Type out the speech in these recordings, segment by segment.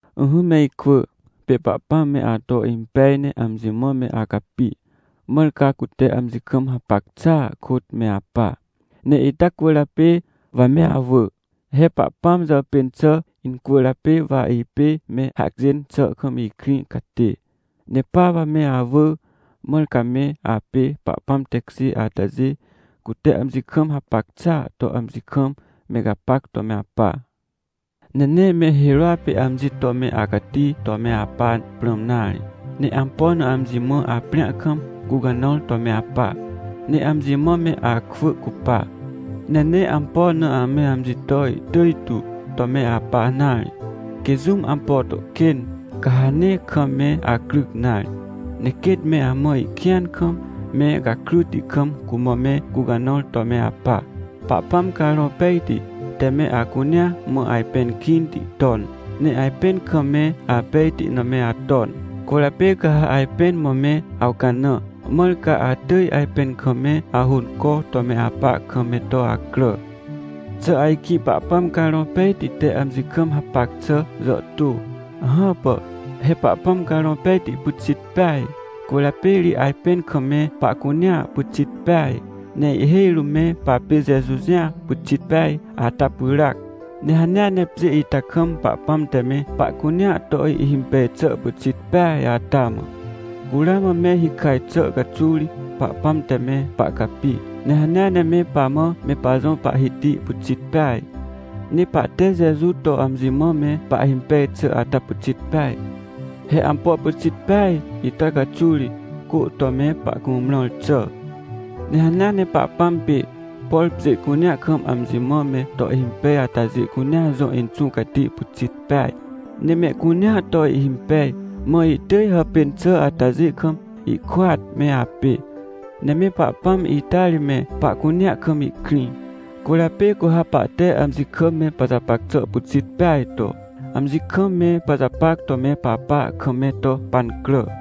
Ỹhỹ me ikwỳ, pê Pahpãm me ato impej ne amji mã me acapi, mãr ca cute amji kam hapac xàa kôt me apa. Ne ita cwỳrjapê wa me awỳ, he Pahpãm jàpên xà incwỳrjapê wa ipê me hacjên xà kam ikrĩ catê. Ne pa wa me awỳ, mãr ca me apê Pahpãm tekjê atajê, cute amji kam hapac xàa to amji kam me gapac to me apa. Ne nee me hirôa pê amji to me acati to me apa prãm nare. Ne ampo na amji mã aprĩa kam, gũcanãr to me apa. Ne amji mã me akwỳ cupa. Ne nee ampo na ame amji to ihtỳj tu to me apa nare. Quê jũm ampo to kên, ca ha nee kam me acryc nare. Ne quêt me amã ihkĩan kam, me gakryti kam cumã me gũcanãr to me apa. Pahpãm Carõ Pejti te me acunea mã ajpẽn kĩnti ton, ne ajpẽn kam me apejti na me aton. Cwỳrjapê ca ha ajpẽn mã me awcanã, mãr ca atỳj ajpẽn kam me ahônco to me apa kam me to acrà. Xà ajkĩ Pahpãm Carõ Pejti te amji kam hapac xà jàhtô? Hãpà! He Pahpãm Carõ Pejti pyxit peaj. Cwỳrjapê ri ajpẽn kam me pahcunea pyxit peaj. Ne ihhêj rũm me papê Jeju jĩ pyxit peaj ata pyràac. Ne hanea ne pjê ita kam Pahpãm te me pahcunea to ihhimpej xà pyxit peaj ata mã, cu ramã me hikaj xà caxuw ri Pahpãm te me pahcapi. Ne hanea ne me pamã me pajõ Pahhiti pyxit peaj. Ne pahte Jeju to amji mã me pahhimpej xà ata pyxit peaj. He ampo pyxit peaj ita caxuw ri cô to me pahcumrãr xà. Ne hanea ne Pahpãm pê, por pjê cunea kam amji mã me to ihhimpej atajê cunea jõ Inxũ Cati pyxit peaj, ne mehcunea to ihhimpej. Mã ihtỳj hàpên xà atajê kam ihkôat me apê, ne me Pahpãm ita ri me pahcunea kam ihkrĩ, cwỳrjapê cu ha pahte amji kam me pajapac xà pyxit peaj to, amji kam me pajapac to me papa kam me to pancrà.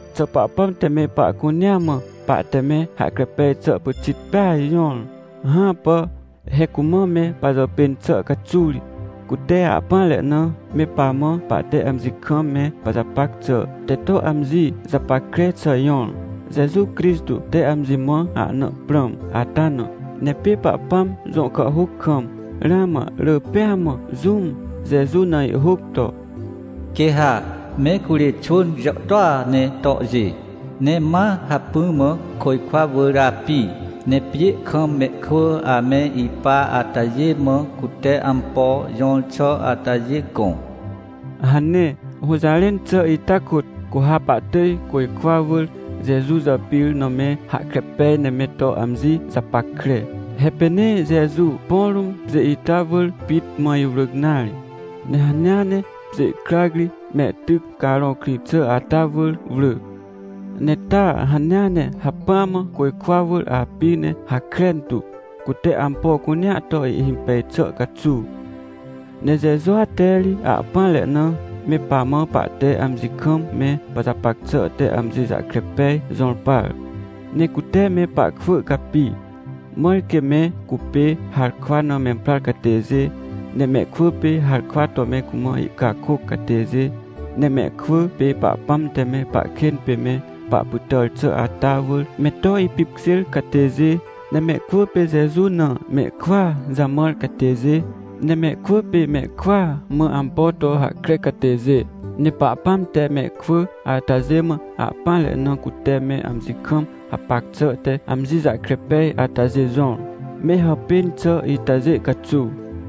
Xà Pahpãm te me pahcunea mã pahte me hahkre pej xà pyxit peaj jõr? Hãpà! He cumã me pajàpên xà caxuw ri, cute ahpỹanre na me pamã pahte amji kam me pajapac xà te to amji japackre xà jõr, Jeju Crixtô te amji mã ahna prãm ata na. Ne pê Pahpãm jõ kàhhôc kam, ramã rỳ pêa mã jũm Jeju na ihhôc to: “Quê ha me curê xwỳn jàhtôa ne tohjê, ne ma hacpỹ mã côjkwa wỳr api. Ne pjê kam mehkwỳ ame ipa atajê mã cute ampo jõr xà atajê gõ” hane. Hũjarẽn xà ita kôt, cu ha pahtỳj côjkwa wỳr Jeju jàpir na me hahkre pej ne me to amji japackre. He pê nee Jeju põ rũm, pjê ita wỳr pit mã iwrỳc nare, ne hanea ne pjê krac ri mehtyc carõ krĩ xà ata wỳr wrỳ. Ne taa hanea ne hacpỹa mã côjkwa wỳr api ne hakren tu, cute ampo cunea to ihhimpej xà caxuw. Ne Jejua te ri ahpỹanre na, me pamã pahte amji kam me pajapac xà te amji jahkre pej jõr par. Ne cute me pahkwỳ capi, mãr quê me cupê harkwa na memprar catêjê, ne mehkwỳ pê harkwa to me cumã ihcakôc catêjê, ne mehkwỳ pê Pahpãm te me pahkên pê me pahpytàr xà ata wỳr me to ipipkjêr catêjê, ne mehkwỳ pê Jeju na mehkwỳa jamãr catêjê, ne mehkwỳ pê mehkwỳa mã ampo to hahkre catêjê. Ne Pahpãm te mehkwỳ atajê mã ahpỹanre na cute me amji kam hapac xà te amji jahkre pej atajê jõr, me hàpên xà itajê caxuw.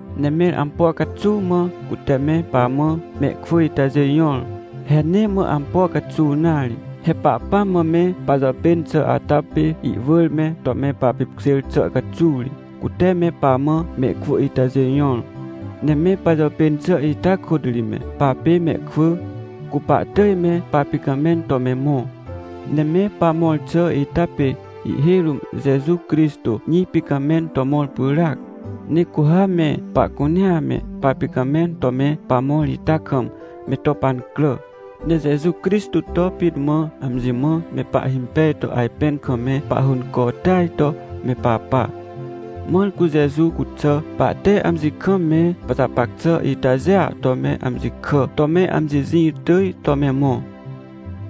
Ne mẽr ampo caxuw mã cute me pamã mehkwỳ itajê jõr? He nee mã ampo caxuw nare. He Pahpãm mã me pajàpên xà ata pê ihwỳr me to me papipkjêr xà caxuw ri, cute me pamã mehkwỳ itajê jõr. Ne me pajàpên xà ita kôt ri me papê mehkwỳ, cu pahtỳj me papicamẽn to me mõ. Ne me pamõr xà ita pê ihhêj rũm Jeju Crixtô jĩ picamẽn to mõr pyràac. Ne cu ha me pahcunea me papicamẽn to me pamõr ita kam me to pancrà, ne Jeju Crixtô to pit mã amji mã me pahhimpej to ajpẽn kam me pahhônco tỳaj to me papa. Mãr cu Jeju cuxà, pahte amji kam me pajapac xà itajêa to me amji kà to me amji jĩ tỳj to me mõ.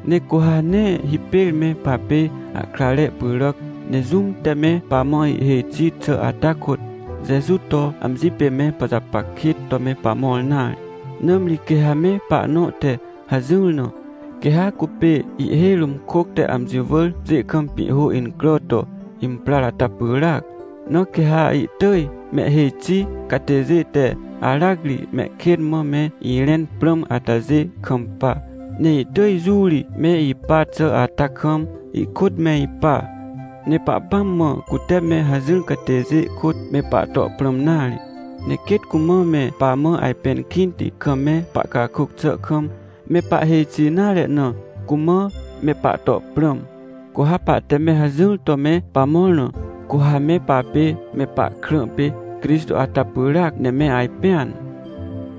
Ne cu ha nee hipêr me papê ahkrare pyràc, ne jũm te me pamã ihhêj xi xà ata kôt, Jeju to amji pê me pajapac kêt to me pamõr nare. Nãmri quê ha me pahnõ te hajỹr na, quê ha cupê ihhêj rũm kôc te amji wỳr pjê kam pĩhhô incrà to imprar ata pyràac, na quê ha ihtỳj mehhêj xi catêjê te aracri mehkên mã me irẽn prãm atajê kampa, ne ihtỳj jũ ri me ipa xà ata kam ihkôt me ipa. Ne Pahpãm mã cute me hajỹr catêjê kôt, me pahto prãm nare. Ne quêt cumã me pamã ajpẽn kĩnti kam me pahcakôc xà kam, me pahhêj xi nare na, cumã me pahto prãm. Cu ha pahte me hajỹr to me pamõr na, cu ha me papê me pahkrã pê Crixtô ata pyràac ne me ajpẽan.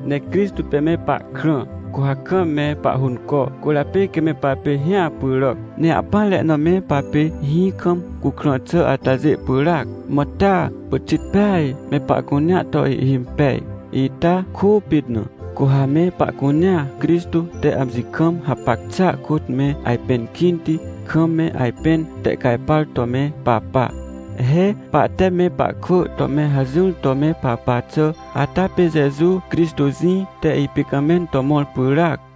Ne Crixtô pê me pahkrã, cu ha kam me pahhônco, cwỳrjapê quê me papê hĩa pyràc. Ne ahpỹanre na me papê hĩ kam cukrã xà atajê pyràac, mã taa pyxit peaj me pahcunea to ihhimpej. Ita kôpit na cu ha me pahcunea Crixtô te amji kam hapac xàa kôt me ajpẽn kĩnti, kam me ajpẽn tehcajpar to me papa. He pahte me pahkwỳ to me hajỹr to me papa xà ata pê Jeju Crixtô jĩ te ipicamẽn to mõr pyràac.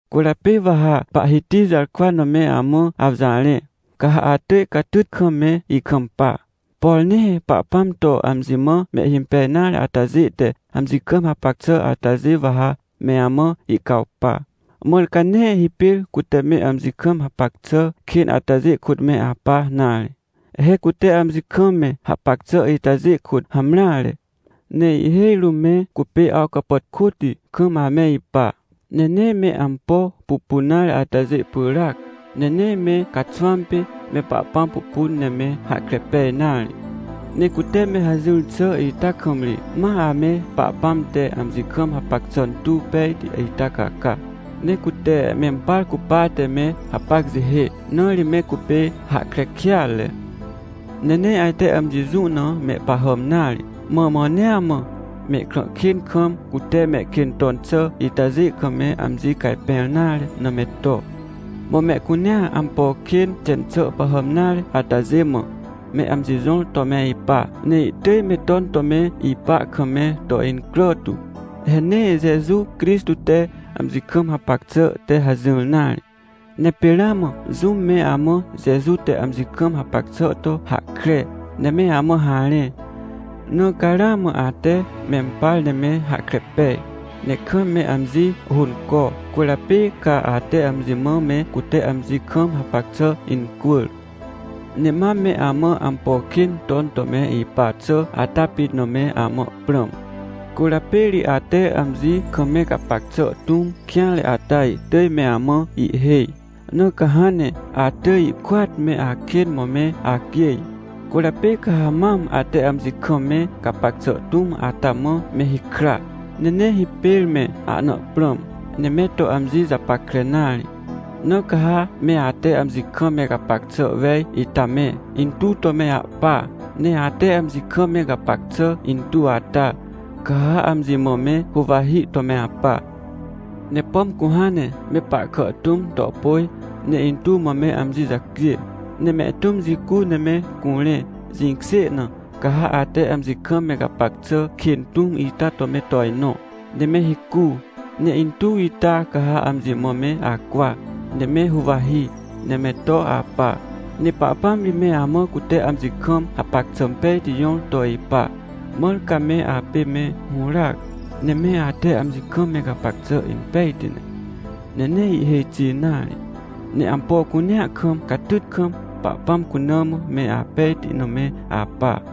Cwỳrjapê wa ha Pahhiti jarkwa na me amã awjarẽ, ca ha atỳj catyt kam me ikampa. Por nee Pahpãm to amji mã mehhimpej nare atajê te amji kam hapac xà atajê wa ha me amã ihcawpa, mãr ca nee hipêr cute me amji kam hapac xà kên atajê kôt me apa nare. He cute amji kam me hapac xà itajê kôt hamreare. Ne ihhêj rũm me cupê awcapàtkôti kam ame ipa, ne nee me ampo pupun nare atajê pyràac. Ne nee me caxwãm pê me Pahpãm pupun ne me hahkre pej nare. Ne cute me hajỹr xà ita kam ri ma ame Pahpãm te amji kam hapac xà tuw pejti ita caca, ne cute mempar cupate me hapac jihê, na ri me cupê hahkre kêatre. Ne nee ajte amji jũ na mehpahàm nare, mã mãnea mã mehkrã kên kam, cute mehkên ton xà itajê kam me amji cajpẽr nare na me to. Mã mehcunea ampo kên xen xà pahàm nare atajê mã, me amji jõr to me ipa, ne ihtỳj me ton to me ipa kam me to incrà tu. He nee Jeju Crixtô te amji kam hapac xà te hajỹr nare. Ne pê ramã jũm me amã Jeju te amji kam hapac xà to hahkre, ne me amã harẽ. Na ca ramã ate mempar ne me hahkre pej, ne kam me amji hônco, cwỳrjapê ca ate amji mã me cute amji kam hapac xà incwỳr. Ne mam me amã ampo kên ton to me ipa xà ata pit na me amã prãm. Cwỳrjapê ri ate amji kam me gapac xà tũm kêanre ata ihtỳj me amã ihhêj, na ca hãn ne atỳj ihkôat me akên mã me acjêj. Cwỳrjapê ca ha mam ate amji kam me gapac xà tũm ata mã me hikra, ne nee hipêr me ahna prãm, ne me to amji japackre nare. Na ca ha me ate amji kam me gapac xà wej ita me, intuw to me ahpa, ne ate amji kam me gapac xà intuw ata, ca ha amji mã me huwahi to me apa. Ne pom cu hãn ne me pahkà tũm to pôj, ne intuw mã me amji jacjê, ne mehtũm jicu ne me curẽ, jĩkjê na, ca ha ate amji kam me gapac xà kên tũm ita to me tojnõ, ne me hicu, ne intuw ita ca ha amji mã me acwa, ne me huwahi, ne me to apa. Ne Pahpãm ri me amã cute amji kam hapac xà pejti jõr to ipa. Mãr ca me apê me hũràac, ne me ate amji kam me gapac xà impejti ne, ne nee ihhêj xi nare, ne ampo cunea kam catyt kam, Pahpãm cuna mã me apejti na me apa.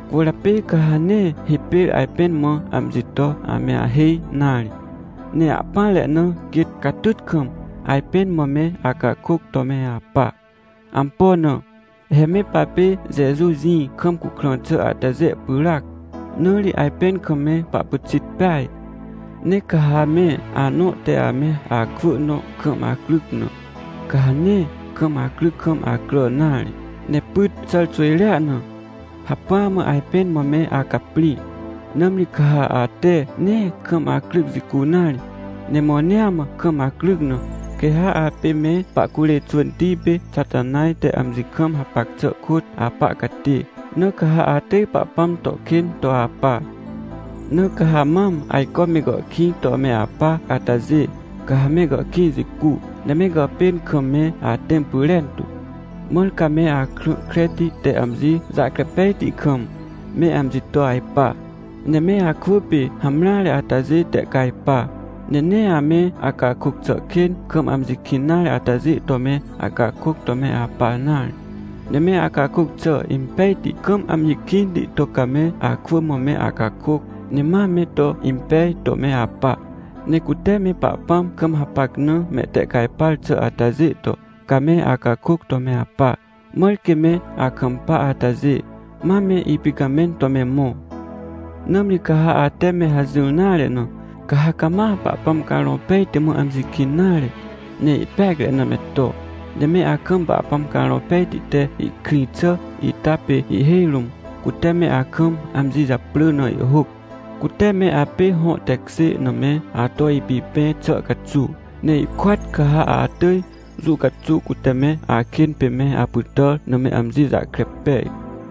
Cwỳrjapê ca ha nee hipêr ajpẽn mã amji to ame ahêj nare. Ne ahpỹanre na quêt catyt kam ajpẽn mã me acakôc to me apa. Ampo na? He me papê Jeju jĩ kam cukrã xà atajê pyràac, na ri ajpẽn kam me pahpyxit peaj. Ne ca ha me anõ te ame akwỳ nõ kam acryc na, ca ha nee kam acryc kam acrà nare, ne pyt xàr xwỳjrea na, hacpỹa mã ajpẽn mã me acaprĩ. Nãmri ca ha ate nee kam acryc jicu nare, ne mãnea mã kam acryc na, quê ha apê me pahcurê xwỳnti pê Xatanaj te amji kam hapac xà kôt apa catê, na ca ha atỳj Pahpãm to kên to apa. Na ca ha mam ajco me gàhkĩj to me apa atajê, ca ha me gàhkĩj jicu, ne me gàpên kam me atẽm pyrentu, mãr ca me akrã kreti te amji jahkre pejti kam, me amji to ajpa, ne me akwỳ pê hamreare atajê tehcajpa. Ne nee ame acakôc xà kên kam amji kĩn nare atajê to me acakôc to me apa nare. Ne me acakôc xà impejti kam amji kĩnti to ca me akwỳ mã me acakôc, ne ma me to impej to me apa. Ne cute me Pahpãm kam hapac na mehtehcajpar xà atajê to, ca me acakôc to me apa, mãr quê me akampa atajê, ma me ipicamẽn to me mõ. Nãmri ca ha ate me hajỹr nare na, ca ha cama Pahpãm Carõ Pejti mã amji kĩn nare, ne ihpeacre na me to. Ne me akam Pahpãm Carõ Pejti te ihkrĩ xà ita pê ihhêj rũm, cute me akam amji japrỳ na ihhôc. Cute me apê hõ tekjê na me ato apipẽ xà caxuw. Ne ihkôat ca ha atỳj jũ caxuw cute me akên pê me apytàr na me amji jahkre pej.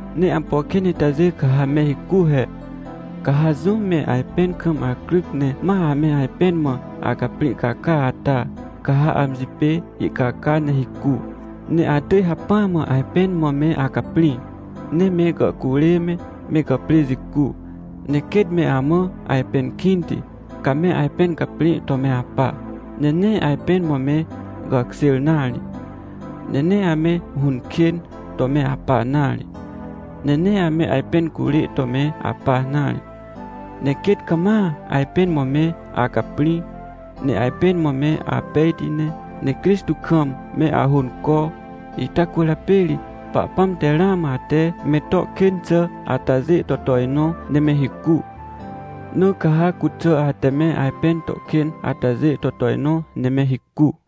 Ne ampo kên itajê ca ha me hicu he. Ca ha jũm me ajpẽn kam acryc ne ma ame ajpẽn mã acaprĩ caca ata, ca ha amji pê ihcaca ne hicu, ne atỳj hacpỹa mã ajpẽn mã me acaprĩ. Ne me gàhcurê me, me gàprê jicu, ne quêt me amã ajpẽn kĩnti, ca me ajpẽn caprĩ to me apa. Ne nee ajpẽn mã me gàkjêr nare. Ne nee ame hũn kên to me apa nare. Ne nee ame ajpẽn curê to me apa nare. Ne quêt cama ajpẽn mã me acaprĩ, ne ajpẽn mã me apejti ne. Ne Crixtô kam me ahônco, ita cwỳrjapê ri Pahpãm te ramã ate me to kên xà atajê to tojnõ ne me hicu. Na ca ha cuxà ate me ajpẽn to kên atajê to tojnõ ne me hicu.